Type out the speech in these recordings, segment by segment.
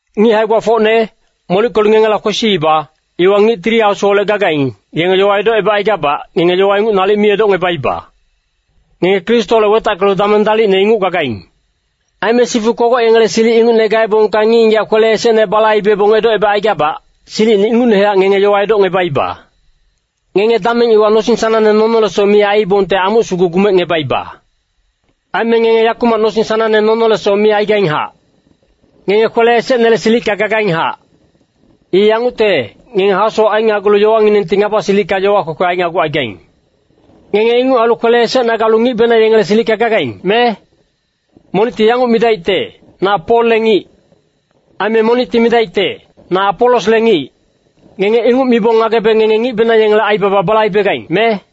Ngic hae-gbafocne, molickelu ngengela kwesiiba, iwa ngic Tili Asuholec gagaing, yenge yowa edocebacaigabac, ngenge yowa ingucne nalic mi edocngebaiba. Ngenge Kristoholec wetackelu dameng dalicne inguc gagaing. Aime sifu kogoc yengele silic ingucne gaebongka ngic-ngigac kwele esecne balaibebong edocebacaigabac, silicine ingucnehac ngenge yowa edocngebaiba. Ngenge dameng iwa nosing sanangne nonolesoc mi aiibongte, amuc sugu gumecngebaiba. Aime ngenge yakumac nosing sanangne nonolesoc mi aigainghac. Ngenge kwele esecnele silicka gagainghac. I yangucte, ngenge hasowac ainagulu yowanginengti ngaba silicka yowa kwekwe ainagucaigaing. Ngenge inguc ailu kwele esecna galu ngicbenang yengele silicka gagaing, me? Monicti yanguc midaicte, “Na Polle ngic.” Aime monicti midaicte, “Na Apolosle ngic.” Ngenge inguc mibong ngagebe ngenge ngic yengele aibaba balaibegaing, me?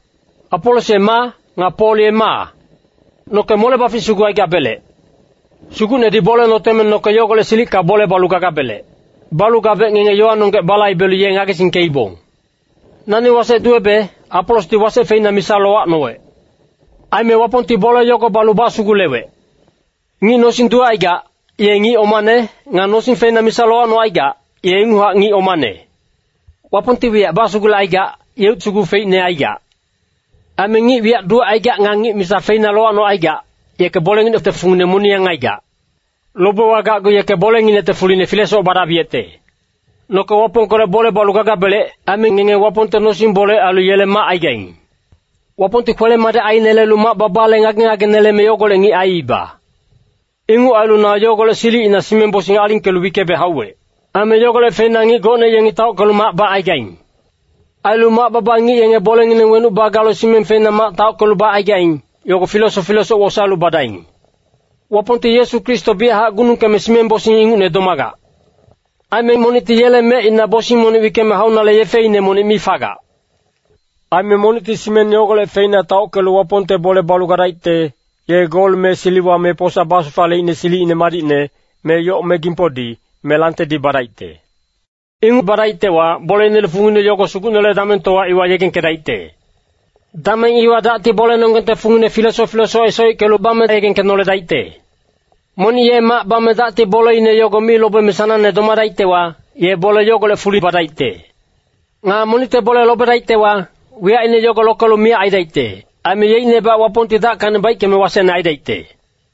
Apolos ye maa? Nga Pol ye maa? Noke mole-bafic sugu aigabelec. Sugucnedi bole noteme noke yogolec silicka bole balu gagabelec. Balu gabec ngenge yowanonggec balaibelu ye ngagesingkeibong. Nani wasec duwebe, Apolosdi wasec feina misa lowacnowec. Aime Wapongti bole yogo balu basugulewec. Ngic nosing duwecaigac, ye ngic omane. Nga nosing feina misa lowacnocaigac, ye inguchac ngic omane. Wapongti wiyac basugulecaigac, yeuc sugu feicne aigac. Aime ngic wiyac duwecaigac nga ngic misa feina lowacnocaigac, yeke bolenginecte fungine moniyang aigac. Lobewa gacgu yeke bolenginecte fuli filesoc badabiyecte. Noke Wapongkolec bole balu gagabelec. Aime ngenge Wapongte nosing-bole ailu yele mac aigaing. Wapongti kwele-madic ainelelu mac-babale ngage-ngage neleme yogolec ngic aiiba. Inguc ailu na yogolec silicina simeng-bosing alingkelu wickebe hauwec. Aime yogolec feina ngic gocne yengi taockelu mac bacaigaing. Ailu mac-baba ngic yenge bolengineng wenuc bagalu simeng feina mac taockelu bacaigaing, yogo filesoc filesoc wosaelu badaing. Wapongti Yesu Kristo biyachac gunungkeme simeng-bosing ingucne domagac. Aime monicti yele mecina bosing monic wickeme haunale yefeine monic mi fagac. Aime monicti simeng yogolec feina taockelu Wapongte bole balu gadaicte, ye gol me siliwa me posa basufaleicne silicine madicne, me yoc me gimpodi, me langtedi badaicte. Inguc badaictewa boleinele fungine yogo Sugucnele damengtowa iwa yegengkedaicte. Dameng iwa dacti bolenonggengte fungine filesoc filesoc esoickelu bame yegengkenoledaicte. Monic ye mac bame dacti boleine yogo mi lobeme sanangne domadaictewa, ye bole yogolec fuli badaicte. Nga monicte bole lobedaictewa, wiyacine yogo lokelu miyac aidaicte. Aime yeicnebac Wapongti dackacni baickeme wasecne aidaicte.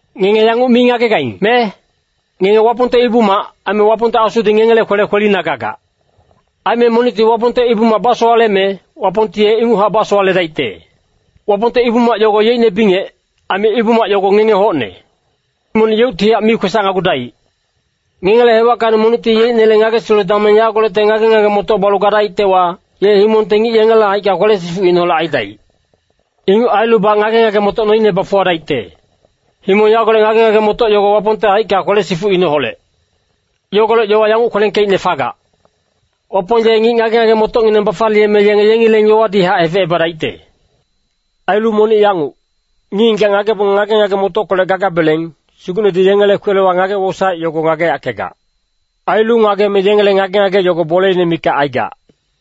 Ngenge yanguc mi ngagegaing, me? Ngenge Wapongte ibu-mac, aime Wapongte Asudi ngengele kwele kwelina gagac. Aime monicti Wapongte ibu-mac basowaleme, Wapongti ye inguchac basowaledaicte. Wapongte ibu-mac yogo yeicne bingec, aime ibu-mac yogo ngenge hocne. Monic yeuctihac mi kwesacnagudaic. Ngengele hewackacni monicti yeicnele ngagesilu dameng yagolecte ngage-ngage-motoc balu gadaictewa, ye himongte ngic yengele haicka kwele-sifucineholec aidaic. Inguc ailubac ngage-ngage-motoc noine bafuwadaicte. Himong yagolec ngage-ngage-motoc yogo Wapongte haicka kwele-sifucineholec. Yogolec yowa yanguc kwelengkeicne fagac, “Wapong ye ngic ngage-ngage-motocngineng bafaliyeme yenge yengileng yowadihac hefecebadaicte.” Ailu monic yanguc, “Ngic-ngigac ngagebong ngage-ngage-motockolec gagabeleng, Sugucnedi yengele kwelewa ngage-wosaec yogo ngageyackegac. Ailu ngageme yengele ngage-ngage yogo boleine mikac aigac.”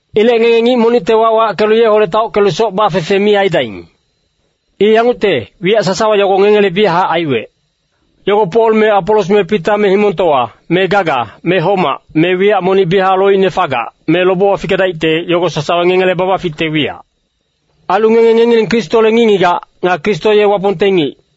Ilec ngenge ngic monicte wac wackelu yeholec taockelu soc bafefe mi aidaing. I yangucte, wiyac sasawa yogo ngengele biyachac aiwec. Yogo Pol me Apolos me Pita me himongtowa, me gaga, me homac, me wiyac monic biyachac loicne fagac, me lobewa fikedaicte, yogo sasawa ngengele babaficte wiyac. Ailu ngenge ngengileng Kristole ngic-ngigac. Nga Kristo ye Wapongte ngic.